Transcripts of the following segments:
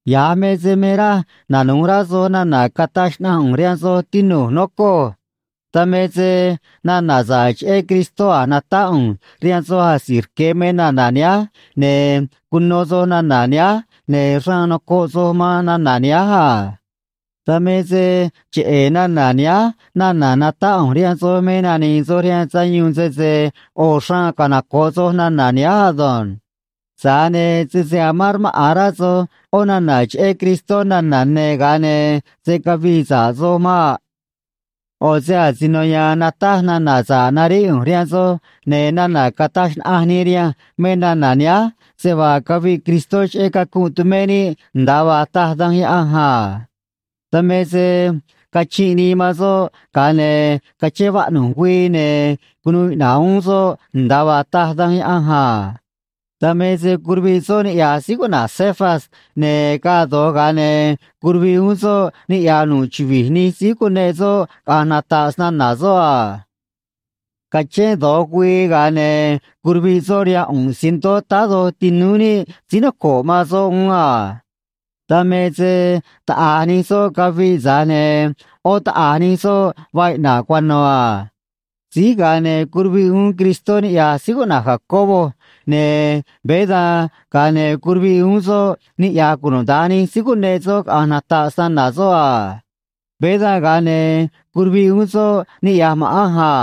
Ya̱j me se me raj nanu̱j rá soj nana̱ cataj xnaꞌanj ꞌu̱nj rihaan soj, tinu̱j, nocoj. Dan me se nana̱ sa̱ꞌ cheꞌé Cristó a̱j natáꞌ ꞌu̱nj rihaan soj asi̱j rque̱ me nana̱ nihánj, ne̱ cuno soj nana̱ nihánj, ne̱ xraan nocoꞌ soj man nana̱ nihánj a. Dan me se cheꞌe̱ nana̱ nihánj nana̱ natáꞌ ꞌu̱nj rihaan soj me nani̱i̱ soj rihaan sayuun, sese ꞌo̱ xraan canoco̱ꞌ soj nana̱ nihánj ado̱nj. Tza̱j ne̱ sese amán rmaꞌa̱n rá soj ꞌó nana̱ cheꞌé Cristó nana̱ ne̱, ga̱a ne̱ se̱ cavii sa̱ꞌ soj maꞌ. ꞌO̱ se asino ya̱a̱n nataj nana̱ sa̱ꞌ naríꞌ ꞌu̱nj rihaan soj, ne̱ nana̱ cataj xnaꞌanj nii rihanj me nana̱ nihánj, se vaa caviꞌ Cristó cheꞌé cacunꞌ tumé níꞌ, nda̱a vaa taj Danj Yaꞌanj a. Dan me se cachinꞌ nii man soꞌ, ga̱a ne̱ cachén vaꞌnu̱j güii, ne̱ cunuu iꞌna̱ꞌ uún soꞌ nda̱a vaa taj Danj Yaꞌanj a. Dan me se curuviꞌ soꞌ niꞌya̱j síí cuꞌna̱j Cefas, ne̱ gaa do̱j, ga̱a ne̱ curuviꞌ uún soꞌ niꞌya̱j nu̱ꞌ chuvi̱j nij síí cuneꞌ soꞌ caꞌa̱nj nata̱ꞌ snana̱ soꞌ a. Cachén do̱j güii, ga̱a ne̱ curuviꞌ soꞌ rihaan ꞌu̱nꞌ cientó táá doj tinúú níꞌ síí noco̱ꞌ man soꞌ uún a. Dan me se taꞌa̱j nij soꞌ caviꞌ, tza̱j ne̱ ꞌó taꞌa̱j nij soꞌ vaa iꞌna̱ꞌ cuano̱ a. Síj ga̱a ne̱ curuviꞌ uún Cristó niꞌya̱j síí cuꞌna̱j Jacobo, ne̱ veé dan, ga̱a ne̱ curuviꞌ uún soꞌ niꞌya̱j cunuda̱nj nij síí cuneꞌ soꞌ caꞌa̱nj nata̱ꞌ snana̱ soꞌ a. Veé dan, ga̱a ne̱ curuviꞌ uún soꞌ niꞌya̱j ma̱ꞌanj a.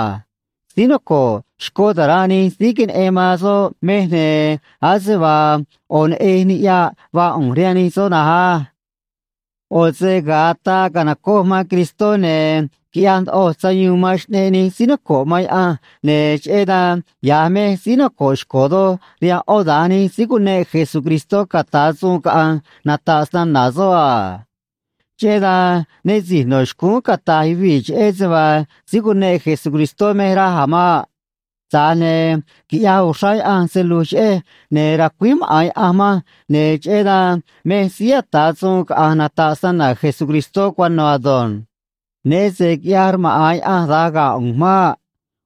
Síí noco̱ꞌ xcó ta̱ranꞌ nij síí queneꞌen man soꞌ mej, ne̱ ase vaa ꞌo̱ neꞌej niꞌyaꞌ vaa ꞌu̱nj rihaan nij soꞌ na̱nj á. ꞌO̱ se ga̱a ataa ca̱nocoj man Cristó, ne̱ quiꞌyaj ndoꞌoj sayuun man xꞌneꞌ nij síí noco̱ꞌ man Yaꞌanj, ne̱ cheꞌé dan ya̱j mej síí noco̱ꞌ xco̱ doj rihaan ꞌó da̱nj nij síí cuneꞌ Jesucristó ca̱ta̱ suun caꞌa̱nj nata̱ꞌ snana̱ soꞌ a. Cheꞌé dan né si̱j no̱ xcúún cata̱j yuvii̱ cheꞌej se vaa síí cuneꞌ Jesucristó mej, raj a̱ maꞌ. Tza̱j ne̱ quiꞌyaj uxrá Yaꞌanj se lu̱j cheꞌej, ne̱ racuíj maꞌa̱n Yaꞌanj manj, ne̱ cheꞌé dan mej síí ata̱ suun caꞌa̱nj nata̱ꞌ snana̱ Jesucristó cuano̱ ado̱nj. Né se quiꞌyaj rmaꞌa̱n Yaꞌanj da̱nj ga̱ ꞌu̱nj maꞌ.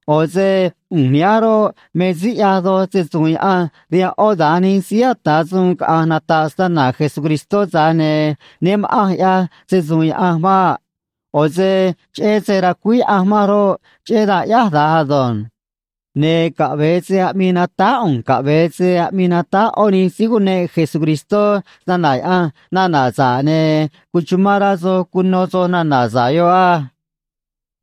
ꞌO̱ se ꞌu̱nj nihánj roꞌ, me síí ꞌyaj doj se‑su̱u̱n Yaꞌanj rihaan ꞌó da̱nj nij síí ata̱ suun caꞌa̱nj nata̱ꞌ snana̱ Jesucristó, tza̱j ne̱ né ma̱ꞌanj ꞌyaj se‑su̱u̱n Yaꞌanj maꞌ. ꞌO̱ se cheꞌé se racuíj Yaꞌanj manj roꞌ, cheꞌé dan ꞌyáj da̱nj ado̱nj. Ne̱ caꞌve̱e se aꞌmii natáj ꞌu̱nj caꞌve̱e se aꞌmii natáj ꞌó nij síí cuneꞌ Jesucristó snana̱ Yaꞌanj nana̱ sa̱ꞌ, ne̱ cuchumán rá soj cuno soj nana̱ sa̱ꞌ yoꞌ á.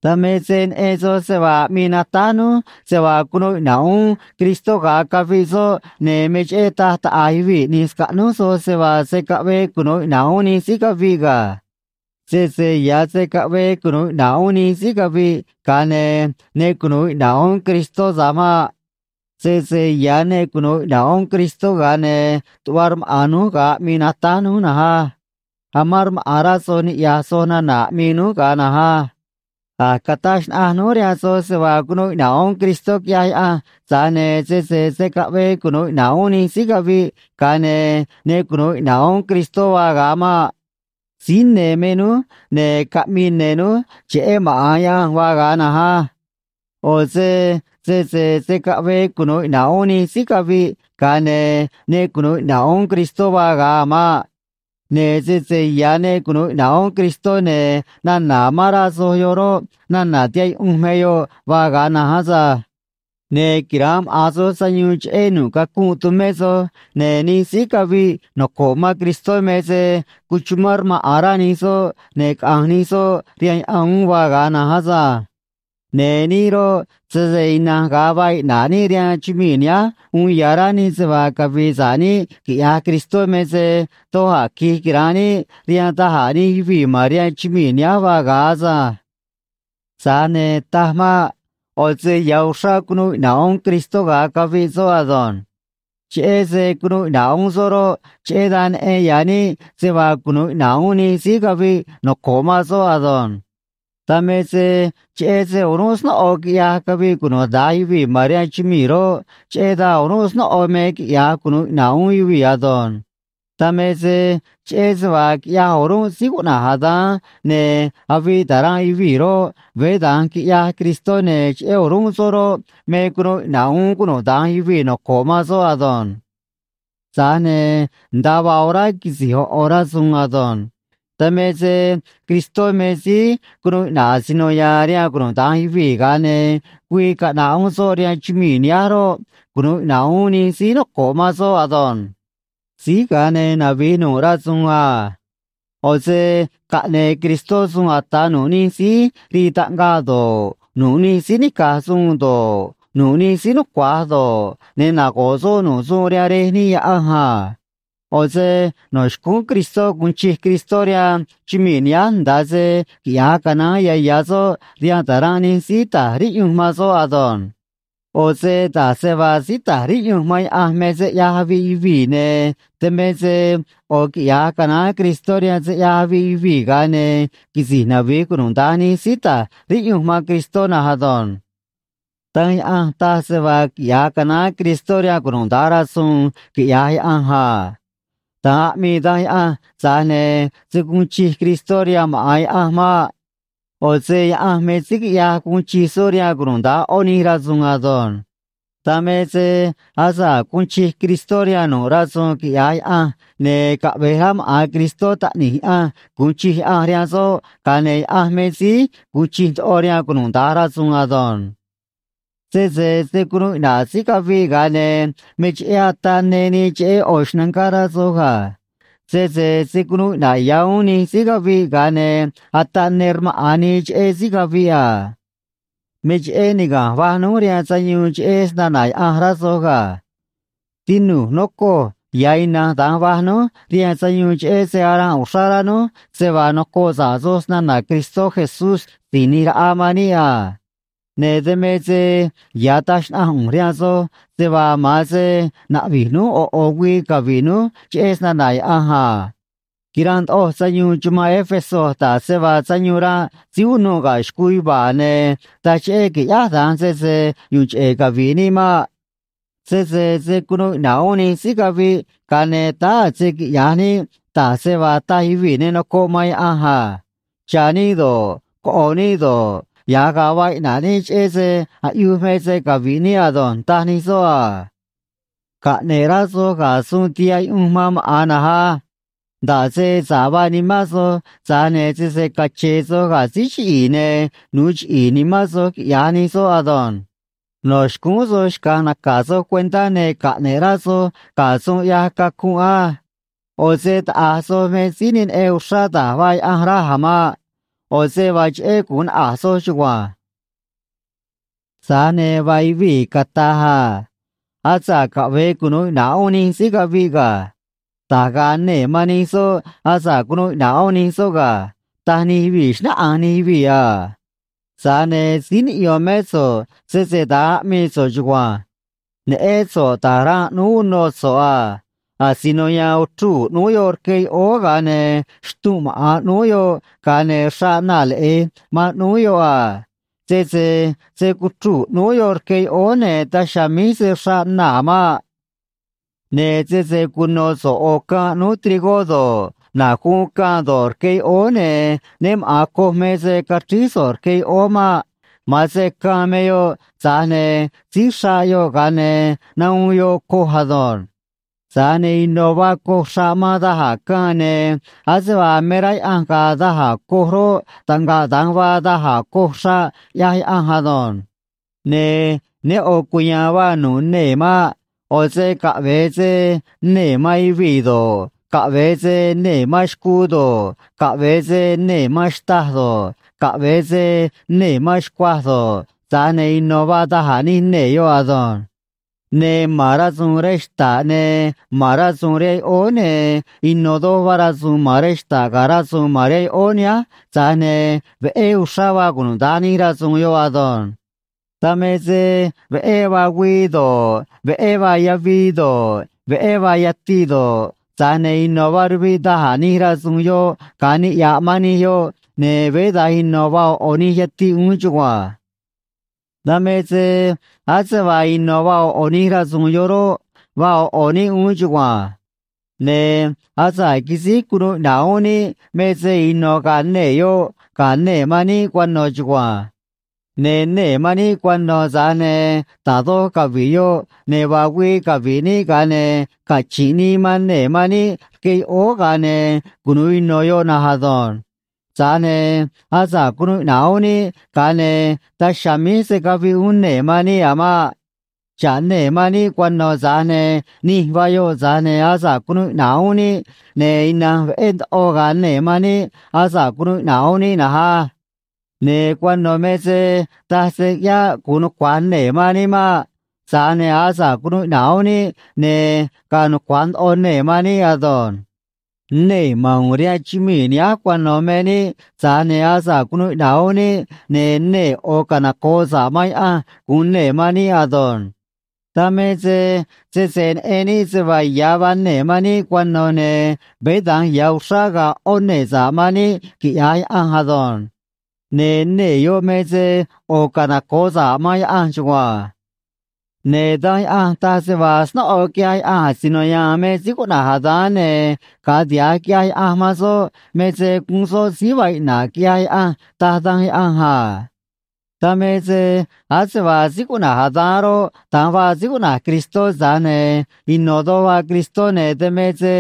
Dan me se neꞌen soj se vaa aꞌmii natáj núj se vaa cunuu iꞌna̱ꞌ uún Cristó ga̱a caviꞌ soꞌ, ne̱ me cheꞌé taj taꞌa̱j yuvii̱ ꞌni̱j scaꞌnúj soj se vaa se̱ caꞌvee cunu̱u iꞌna̱ꞌ uún nij síí caviꞌ ga̱. Sese ya̱ se̱ caꞌvee cunu̱u iꞌna̱ꞌ uún nij síí caviꞌ, ga̱a ne̱ ne cunu̱u iꞌna̱ꞌ uún Cristó tza̱j maꞌ. Sese ya̱ ne cunu̱u iꞌna̱ꞌ uún Cristó, ga̱a ne̱ tuꞌva rmaꞌa̱n núj ga̱a aꞌmii natáj núj na̱nj á. Amán rmaꞌa̱n rá soj niꞌya̱j soj nana̱ aꞌmii núj ga̱a na̱nj á. A̱j cataj xnaꞌanj núj rihaan soj se vaa cunuu iꞌna̱ꞌ uún Cristó, quiꞌyaj Yaꞌanj, tza̱j ne̱ sese se̱ caꞌvee cunu̱u iꞌna̱ꞌ uún nij síí caviꞌ, ga̱a ne̱ ne cunu̱u iꞌna̱ꞌ uún Cristó vaa ga̱a maꞌ. Síí ne̱ me núj, ne̱ caꞌmii ne̱ núj cheꞌé maꞌa̱n Yaꞌanj vaa ga̱a na̱nj á. ꞌO̱ se sese se̱ caꞌvee cunu̱u iꞌna̱ꞌ uún nij síí caviꞌ, ga̱a ne̱ ne cunu̱u iꞌna̱ꞌ uún Cristó vaa ga̱a a̱ maꞌ. Ne̱ sese ya̱ ne cunu̱u iꞌna̱ꞌ uún Cristó, ne̱ nana̱ amán rá soj yoꞌ roꞌ, nana̱ tihaꞌ yuꞌunj me yoꞌ vaa ga̱a na̱nj asânj. Ne̱ quira̱nꞌ maꞌa̱n soj sayuun cheꞌé nu̱ꞌ cacunꞌ tumé soj, ne̱ nij síí caviꞌ noco̱ꞌ man Cristó me se cuchumán rmaꞌa̱n rá nij soꞌ, ne̱ caꞌanj nij soꞌ rihaan yaꞌan uún vaa ga̱a na̱nj asânj. Ne̱ níꞌ roꞌ, sese ina̱nj ga̱a vaa iꞌna̱ꞌ níꞌ rihaan chumii̱ nihánj uun ya̱ rá níꞌ se vaa cavi̱i̱ sa̱ꞌ níꞌ quiꞌyaj Cristó me se doj a̱ qui̱j quira̱nꞌ níꞌ rihaan da̱j a̱ nij yuvii̱ ma̱n rihaan chumii̱ nihánj vaa ga̱a asânj. Tza̱j ne̱, taj maꞌ. ꞌO̱ se ya̱ uxrá cunuu iꞌna̱ꞌ uún Cristó ga̱a caviꞌ soꞌ ado̱nj. Cheꞌé se cunuu iꞌna̱ꞌ uún soꞌ roꞌ, cheꞌé dan neꞌen ya̱ níꞌ se vaa cunu̱u iꞌna̱ꞌ uún nij síí caviꞌ noco̱ꞌ man soꞌ ado̱nj. Dan me se cheꞌé se o̱rúnꞌ snóꞌo quiꞌyaj caviꞌ cunuda̱nj yuvii̱ ma̱n rihaan chumii̱ roꞌ, cheꞌé dan o̱rúnꞌ snóꞌo me quiꞌya̱j cunu̱u iꞌna̱ꞌ uún yuvii̱ ado̱nj. Dan me se cheꞌé se vaa quiꞌyaj o̱rúnꞌ síí cuꞌna̱j Adán ne̱ aviꞌ ta̱ranꞌ yuvii̱ roꞌ, veé da̱nj quiꞌyaj Cristó, ne̱ cheꞌé o̱rúnꞌ soꞌ roꞌ, me cunu̱u iꞌna̱ꞌ uún cunuda̱nj yuvii̱ noco̱ꞌ man soꞌ ado̱nj. Tza̱j ne̱ nda̱a vaa orá quisi̱j ꞌo̱ ꞌo̱ rasu̱u̱n ado̱nj. Dan me se Cristó me síí cunuu iꞌna̱ꞌ asino ya̱a̱n rihaan cunuda̱nj yuvii̱, ga̱a ne̱ güii caꞌna̱ꞌ uún soꞌ rihaan chumii̱ nihánj roꞌ, cunu̱u iꞌna̱ꞌ uún nij síí noco̱ꞌ man soꞌ ado̱nj. Síj ga̱a ne̱ navi̱j nu̱ꞌ rasu̱u̱n a. ꞌO̱ se caꞌne̱e̱ Cristó suun ata̱ nu̱ꞌ nij síí rii taꞌngaꞌ do̱ꞌ, nu̱ꞌ nij síí nica̱j suun do̱ꞌ, nu̱ꞌ nij síí nucua̱j do̱ꞌ, ne̱ nago̱ꞌ soꞌ nu̱ꞌ suun rihaan Rej níꞌ Yaꞌanj a. ꞌO̱ se no̱ xcúún Cristó gu̱un chij Cristó rihaan chumii̱ nihánj nda̱a se quiꞌya̱j canaán ya̱ ya̱ soꞌ rihaan ta̱ranꞌ nij síí ta̱j riꞌyunj man soꞌ ado̱nj. ꞌO̱ se da̱j se vaa síí ta̱j riꞌyunj man Yaꞌanj me se ꞌyaj aviꞌ yuvii̱, ne̱ dan me se ꞌo̱ quiꞌya̱j canaán Cristó rihaan se ꞌyaj aviꞌ yuvii̱, ga̱a ne̱ quisi̱j navi̱j cunuda̱nj nij síí ta̱j riꞌyunj man Cristó na̱nj ado̱nj. Danj Yaꞌanj taj se vaa quiꞌya̱j canaán Cristó rihaan cunuda̱nj rasu̱u̱n, quiꞌya̱j Yaꞌanj a. Da̱nj aꞌmii Danj Yaꞌanj, tza̱j ne̱ se̱ guun chij Cristó rihaan maꞌa̱n Yaꞌanj maꞌ. ꞌO̱ se Yaꞌanj me síí quiꞌyaj guun chij soꞌ rihaan cunuda̱nj ꞌó nij rasu̱u̱n ado̱nj. Dan me se asa̱ꞌ guun chij Cristó rihaan nu̱ꞌ rasu̱u̱n quiꞌya̱j Yaꞌanj, ne̱ caꞌve̱j rá maꞌa̱n Cristó Taꞌni̱j Yaꞌanj gu̱un chij Yaꞌanj rihaan soꞌ, ga̱a ne̱ Yaꞌanj me síí gu̱un chij ndoꞌo rihaan cunuda̱nj rasu̱u̱n ado̱nj. Sese se̱ cunuu iꞌna̱ꞌ síí caviꞌ, ga̱a ne̱ me cheꞌé ataꞌ ne nii cheꞌé ꞌo̱ xnangá, rá soj ga̱. Sese se̱ cunuu iꞌna̱ꞌ ya̱ uún nij síí caviꞌ, ga̱a ne̱ ataꞌ ne rmaꞌa̱n nii cheꞌé síí caviꞌ a. Me cheꞌé niga̱nj vaj núj rihaan sayuun cheꞌé snana̱ Yaꞌanj, rá soj ga̱. Tinu̱j, nocoj, ya̱ ina̱nj da̱nj vaj núj rihaan sayuun cheꞌé se aranꞌ uxrá rá núj se vaa nocoꞌ sa̱ꞌ soj snana̱ Cristó Jesús Si̱j ꞌNi̱j Raꞌa man níꞌ a. Ne̱ dan me se ya̱ taj xnaꞌanj ꞌu̱nj rihaan soj se vaa ma̱an se naꞌvi̱j núj ꞌo̱ ꞌo̱ güii cavi̱ꞌ núj cheꞌé snana̱ Yaꞌanj a. Quiranꞌ ndoꞌoj sayuun chumanꞌ Éfeso da̱j se vaa sayuun ranꞌ síí unuꞌ ga̱ xcuu yuva̱a̱, ne̱ taj cheꞌé quiꞌyáj da̱nj sese yu̱u̱n cheꞌe̱ cavi̱ꞌ níꞌ maꞌ. Sese se̱ cunuu iꞌna̱ꞌ uún nij síí caviꞌ, ga̱a̱ ne̱ táá a̱ se quiꞌya̱j níꞌ da̱j se vaa taj yuvii̱ ne nocoꞌ man Yaꞌanj a. “Cha̱ níꞌ do̱ꞌ, coꞌo̱ níꞌ do̱ꞌ, ya̱j ga̱a vaa iꞌna̱ꞌ níꞌ, cheꞌé se aꞌyuj me se cavi̱ꞌ níꞌ ado̱nj”, taj nij soꞌ a. Caꞌne̱ꞌ rá soj ga̱ suun tihaꞌ yuꞌunj man maꞌa̱n na̱nj á. Nda̱ꞌ se sa̱ꞌ vaa nimán soj, tza̱j ne̱ sese cache̱e̱ soj ga̱ síí chiꞌi̱i̱, ne̱ nu̱u chiꞌi̱i̱ nimán soj, quiꞌya̱j nij soꞌ ado̱nj. No̱ xcúún soj xca̱j naca̱ soj cuentá, ne̱ caꞌne̱ꞌ rá soj ga̱ suun ꞌyaj cacunꞌ á. ꞌO̱ se taꞌa̱j soj me síí ne neꞌen uxrá da̱j vaa Yaꞌanj, raj a̱ maꞌ. ꞌO̱ se vaa cheꞌé gu̱un naꞌa̱j soj chugua̱nj. Tza̱j ne̱ vaa yuvii̱ cata̱j a: “Asa̱ꞌ caꞌve̱e cunu̱u iꞌna̱ꞌ uún nij síí caviꞌ ga̱. Da̱j ga̱a̱ nee̱ man nij soꞌ asa̱ꞌ cunuu iꞌna̱ꞌ uún nij soꞌ ga̱”, taj nij yuvii̱, xnáꞌanj nij yuvii̱ a. Tza̱j ne̱ síí niꞌyo̱n mé so̱ꞌ, sese da̱nj aꞌmii so̱ꞌ chugua̱nj. Neꞌén so̱ꞌ da̱j ranꞌ ꞌnúú unô so̱ꞌ a. Asino ya̱a̱n uchruu̱ ꞌnúú yoꞌ rque yoꞌóó, ga̱a ne̱ xtunꞌ maꞌa̱n ꞌnúú yoꞌ, ga̱a ne̱ xraꞌ naa̱ leꞌe̱j man ꞌnúú yoꞌ a. Sese se̱ cuchruu̱ ꞌnúú yoꞌ rque yoꞌóó, ne̱ daj chiha̱a̱ míj se̱ xraꞌ naa̱ maꞌ. Ne̱ sese cuno̱ so̱ꞌ ꞌo̱ caân ꞌnúú trigó do̱ꞌ, na̱j guun caân do̱ꞌ, rque yoꞌóó, ne̱ né maꞌa̱n coj me se caxríj so̱ꞌ rque yoꞌóó maꞌ. Ma̱an se caân me yoꞌ, tza̱j ne̱ síj xraꞌ yoꞌ, ga̱a ne̱ nahuun yoꞌ coj ado̱nj. Tza̱j ne̱ ino̱ vaa coj xraꞌ man da̱j a̱ caân, ne̱ ase vaa me rá Yaꞌanj ga̱a̱ da̱j a̱ coj roꞌ, taꞌngaꞌ da̱nj vaa da̱j a̱ coj xraꞌ, ꞌyaj Yaꞌanj ado̱nj. Ne̱ ne ꞌo̱ cuya̱a̱n vaa nu̱ꞌ nee̱ maꞌ. ꞌO̱ se caꞌve̱e se nee̱ man yuvii̱ do̱ꞌ, caꞌve̱e se nee̱ man xcuu do̱ꞌ, caꞌve̱e se nee̱ man xtâj do̱ꞌ, caꞌve̱e se nee̱ man xcuaj do̱ꞌ, tza̱j ne̱ ino̱ vaa da̱j a̱ nij nee̱ yoꞌ ado̱nj. Ne̱ ma̱n rasu̱u̱n rej xta̱ꞌ, ne̱ ma̱n rasu̱u̱n rihaan yoꞌóó, ne̱ ino̱ doj vaa rasu̱u̱n ma̱n rej xta̱ꞌ ga̱ rasu̱u̱n ma̱n rihaan yoꞌóó nihánj, tza̱j ne̱ veꞌé uxrá vaa cunuda̱nj nij rasu̱u̱n yoꞌ ado̱nj. Dan me se veꞌé vaa güii do̱ꞌ, veꞌé vaa yavii do̱ꞌ, veꞌé vaa yatiꞌ do̱ꞌ, tza̱j ne̱ ino̱ vaa ruviꞌ da̱j a̱ nij rasu̱u̱n yoꞌ ga̱a niꞌya̱ꞌ man nij yoꞌ, ne̱ veé da̱nj ino̱ vaa ꞌo̱ ꞌo̱ nij yatiꞌ uún chugua̱nj. Dan me se ase vaa ino̱ vaa ꞌo̱ ꞌo̱ nij rasu̱u̱n yoꞌ roꞌ, vaa ꞌo̱ ꞌo̱ níꞌ uún chugua̱nj. Ne̱ asa̱ꞌ quisíj cunuu iꞌna̱ꞌ uún níꞌ me se ino̱ ga̱a̱ nee̱ yoꞌ ga̱ nee̱ man níꞌ cuano̱ chugua̱nj. Ne̱ nee̱ man níꞌ cuano̱, tza̱j ne̱ da̱j doj cavi̱ꞌ yoꞌ, ne̱ vaa güii cavi̱ꞌ níꞌ, ga̱a ne̱ cachi̱nꞌ nii man nee̱ man níꞌ rque yoꞌóó, ga̱a ne̱ cunu̱u ino̱ yoꞌ na̱nj ado̱nj. Tza̱j ne̱ asa̱ꞌ cunuu iꞌna̱ꞌ uún níꞌ, ga̱a ne̱ daj chiha̱a̱ míj se̱ caviꞌ uún nee̱ man níꞌ a̱ maꞌ. Xa̱ꞌ nee̱ man níꞌ cuano̱, tza̱j ne̱ nij vaa yoꞌ, tza̱j ne̱ asa̱ꞌ cunuu iꞌna̱ꞌ uún níꞌ, ne̱ ina̱nj veꞌé ndoꞌo ga̱a̱ nee̱ man níꞌ asa̱ꞌ cunuu iꞌna̱ꞌ uún níꞌ na̱nj á. Ne̱ cuano̱ me se taj se ꞌyáꞌ gu̱un nucua̱j nee̱ man níꞌ maꞌ. Tza̱j ne̱ asa̱ꞌ cunuu iꞌna̱ꞌ uún níꞌ, ne̱ ga̱a̱ nucua̱j ndoꞌo nee̱ man níꞌ ado̱nj. Nee̱ ma̱n u̱u̱n rihaan chumii̱ nihánj cuano̱ me níꞌ, tza̱j ne̱ asa̱ꞌ cunuu iꞌna̱ꞌ uún níꞌ, ne̱ nee̱ ꞌo̱ canoco̱ꞌ sa̱ꞌ man Yaꞌanj gu̱un nee̱ man níꞌ ado̱nj. Dan me se sese neꞌen níꞌ se vaa ya̱ vaa nee̱ man níꞌ cuano̱, ne̱ veé da̱nj ya̱ uxrá ga̱a̱ ꞌó nee̱ sa̱ꞌ man níꞌ, quiꞌya̱j Yaꞌanj ado̱nj. Ne̱ nee̱ yoꞌ me se ꞌo̱ canoco̱ꞌ sa̱ꞌ man Yaꞌanj chugua̱nj. Ne̱ Danj Yaꞌanj taj se vaa snóꞌo quiꞌyaj Yaꞌanj asino ya̱a̱n me síí cuꞌna̱j Adán, ne̱ ga̱a tiha̱j quiꞌyaj Yaꞌanj man soꞌ me se guun soꞌ síí vaa iꞌna̱ꞌ, quiꞌyaj Yaꞌanj, taj Danj Yaꞌanj a. Dan me se ase vaa síí cuꞌna̱j Adán roꞌ, da̱nj vaa síí cuꞌna̱j Cristó, tza̱j ne̱ ino̱ doj vaa Cristó, ne̱ dan me se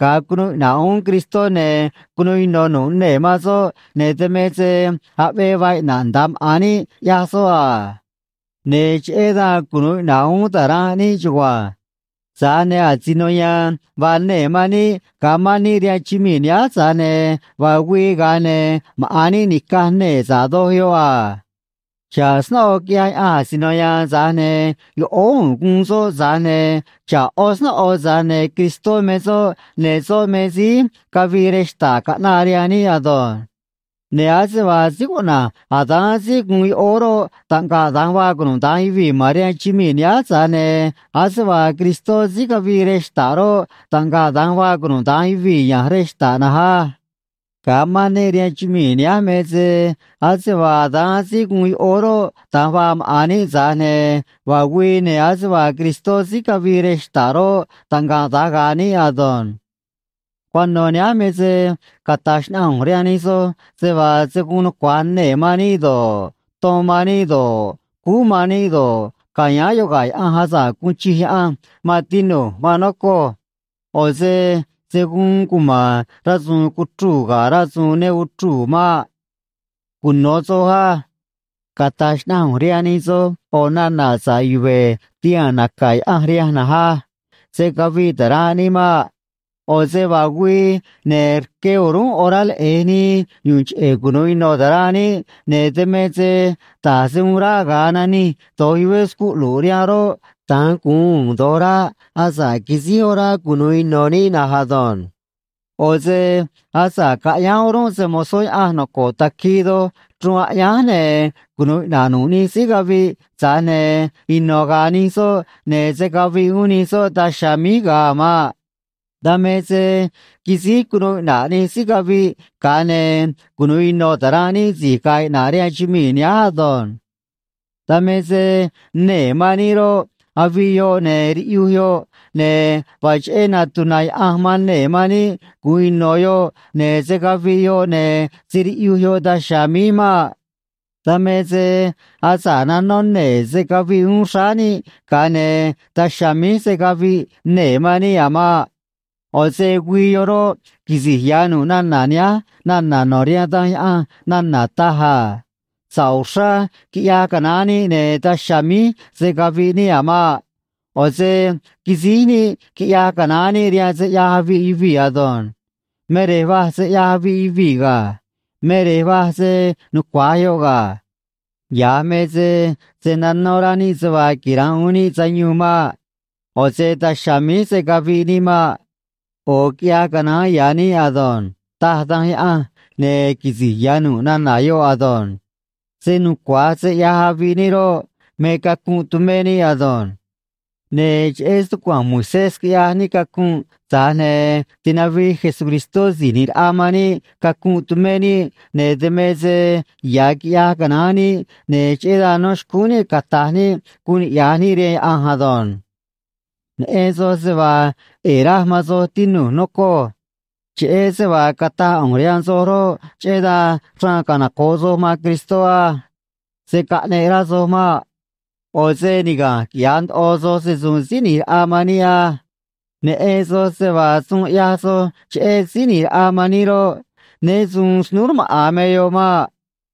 ga̱a cunuu iꞌna̱ꞌ uún Cristó, ne̱ cunuu ino̱ nu̱ꞌ nee̱ man soꞌ, ne̱ dan me se aꞌvee vaa iꞌna̱ꞌ nda̱a maꞌa̱n níꞌ, ꞌyaj soꞌ a. Ne̱ cheꞌé dan cunu̱u iꞌna̱ꞌ uún ta̱ranꞌ níꞌ chugua̱nj. Tza̱j ne̱ asino ya̱a̱n vaa nee̱ man níꞌ ga̱a mán níꞌ rihaan chumii̱ nihánj, tza̱j ne̱ vaa güii, ga̱a ne̱ maꞌa̱n níꞌ ni̱caj nee̱ sa̱ꞌ doj yoꞌ a. Xa̱ꞌ snóꞌo quiꞌyaj Yaꞌanj asino ya̱a̱n, tza̱j ne̱ yoꞌóó u̱u̱n guun soꞌ, tza̱j ne̱ xa̱ꞌ ꞌó snóꞌo, tza̱j ne̱ Cristó me soꞌ, ne̱ soꞌ me síí cavii rej xta̱ꞌ caꞌnaꞌ rihaan níꞌ ado̱nj. Ne̱ ase vaa síí cuꞌna̱j Adán síí guun yoꞌóó roꞌ, taꞌngaꞌ da̱nj vaa cunuda̱nj yuvii̱ ma̱n rihaan chumii̱ nihánj, tza̱j ne̱ ase vaa Cristó síí cavii rej xta̱ꞌ roꞌ, taꞌngaꞌ da̱nj vaa cunuda̱nj yuvii̱ ya̱nj rej xta̱ꞌ na̱nj á. Ga̱a mán níꞌ rihaan chumii̱ nihánj me se ase vaa Adán síí guun yoꞌóó roꞌ, da̱nj vaa maꞌa̱n níꞌ, tza̱j ne̱ vaa güii, ne̱ ase vaa Cristó síí cavii rej xta̱ꞌ roꞌ, taꞌngaꞌ da̱nj ga̱a̱ níꞌ ado̱nj. Cuano̱ nihánj me se cata̱j xnaꞌanj ꞌu̱nj rihaan nij soj se vaa se̱ guun nucua̱j nee̱ man níꞌ do̱ꞌ, ton man níꞌ do̱ꞌ, cúú man níꞌ do̱ꞌ, ca̱yáán yoꞌ ga̱ Yaꞌanj asa̱ꞌ guun chij Yaꞌanj, maan tinu̱j, maan nocoj. ꞌO̱ se se̱ guun cuma̱n rasu̱u̱n cuchru̱u̱ ga̱ rasu̱u̱n ne uchruu̱ maꞌ. Cuno̱ soj á. Cata̱j xnaꞌanj ꞌu̱nj rihaan nij soj ꞌo̱ nana̱ sa̱ꞌ yuve̱ tihaa̱n naca̱ Yaꞌanj rihanj na̱nj á: Se̱ caviꞌ ta̱ranꞌ níꞌ maꞌ. ꞌO̱ se vaa güii, ne̱ rque o̱rúnꞌ orá leꞌe̱j nii yu̱u̱n cheꞌe̱ cunu̱u ino̱ ta̱ranꞌ níꞌ, ne̱ dan me se da̱j se uun ráꞌ ga̱a nanij do̱j yuvé scuꞌlu̱ꞌ rihanꞌ roꞌ, da̱nj gu̱un u̱u̱n do̱j ráꞌ asa̱ꞌ quisíj orá cunu̱u ino̱ níꞌ na̱nj ado̱nj. ꞌO̱ se asa̱ꞌ caꞌyánj o̱rúnꞌ se‑mo̱zó Yaꞌanj noco̱ꞌ taquii doj chruun aꞌyánj, ne̱ cunu̱u iꞌna̱ꞌ nu̱ꞌ nij síí caviꞌ, tza̱j ne̱ ino̱ ga̱a̱ nij soꞌ, ne̱ se̱ caviꞌ uún nij soꞌ daj chiha̱a̱ míj ga̱a a̱ maꞌ. Dan me se quisíj cunuu iꞌna̱ꞌ nij síí caviꞌ, ga̱a ne̱ cunu̱u ino̱ ta̱ranꞌ níꞌ si̱j ga̱a̱ iꞌna̱ꞌ rihaan chumii̱ nihánj ado̱nj. Dan me se nee̱ man níꞌ roꞌ, aviꞌ yoꞌ ne̱ riꞌyuj yoꞌ, ne̱ vaa cheꞌé natuna̱ Yaꞌanj man nee̱ man níꞌ gu̱un ino̱ yoꞌ, ne̱ se̱ caviꞌ yoꞌ ne̱ se̱ riꞌyuj yoꞌ daj chiha̱a̱ míj maꞌ. Dan me se asa̱ꞌ nanó nee̱ se̱ caviꞌ uún xráá níꞌ, ga̱a ne̱ daj chiha̱a̱ míj se̱ caviꞌ nee̱ man níꞌ a̱ maꞌ. ꞌO̱ se güii yoꞌ roꞌ, quisi̱j ya̱ nu̱ꞌ nana̱ nihánj nana̱ no̱ rihaan Danj Yaꞌanj nana̱ taj a: “Sa̱ꞌ uxrá quiꞌyaj canaán níꞌ, ne̱ daj chiha̱a̱ míj se̱ caviꞌ níꞌ a̱ maꞌ. ꞌO̱ se quisíj níꞌ quiꞌyaj canaán níꞌ rihaan se ꞌyaj aviꞌ yuvii̱ ado̱nj. Me rej vaj se ꞌyaj aviꞌ yuvii̱ ga̱. Me rej vaj se nucua̱j yoꞌ ga̱. Ya̱j me se se̱ nanó rá níꞌ se vaa quira̱nꞌ uún níꞌ sayuun maꞌ. ꞌO̱ se daj chiha̱a̱ míj se̱ caviꞌ níꞌ maꞌ. ꞌO̱ quiꞌyaj canaán ya̱ níꞌ ado̱nj”, taj Danj Yaꞌanj, ne̱ quisi̱j ya̱ nu̱ꞌ nana̱ yoꞌ ado̱nj. Se nucua̱j se ꞌyaj aviꞌ níꞌ roꞌ, me cacunꞌ tumé níꞌ ado̱nj. Ne̱ cheꞌé stucua̱nj Moisés quiꞌyaj níꞌ cacunꞌ, tza̱j ne̱ tinavij Jesucristó Si̱j ꞌNi̱j Raꞌa man níꞌ cacunꞌ tumé níꞌ, ne̱ dan me se ya̱ quiꞌyaj canaán níꞌ, ne̱ cheꞌé dan no̱ xcúún níꞌ cata̱j níꞌ guun niꞌya̱j níꞌ rihaan Yaꞌanj ado̱nj. Neꞌen soj se vaa ꞌe̱e̱ raj man soj, tinu̱j, nocoj. Cheꞌé se vaa cataj ꞌu̱nj rihaan soj roꞌ, cheꞌé dan xraan canoco̱ꞌ soj man Cristó á. Se̱ caꞌneꞌ rá soj maꞌ. ꞌO̱ se niga̱nj quiꞌya̱j ndoꞌo soj se‑su̱u̱n Síí ꞌNi̱j Raꞌa man níꞌ á. Neꞌen soj se vaa suun ꞌyaj soj cheꞌé Síí ꞌNi̱j Raꞌa man níꞌ roꞌ, né su̱u̱n snúú rmaꞌa̱n me yoꞌ maꞌ.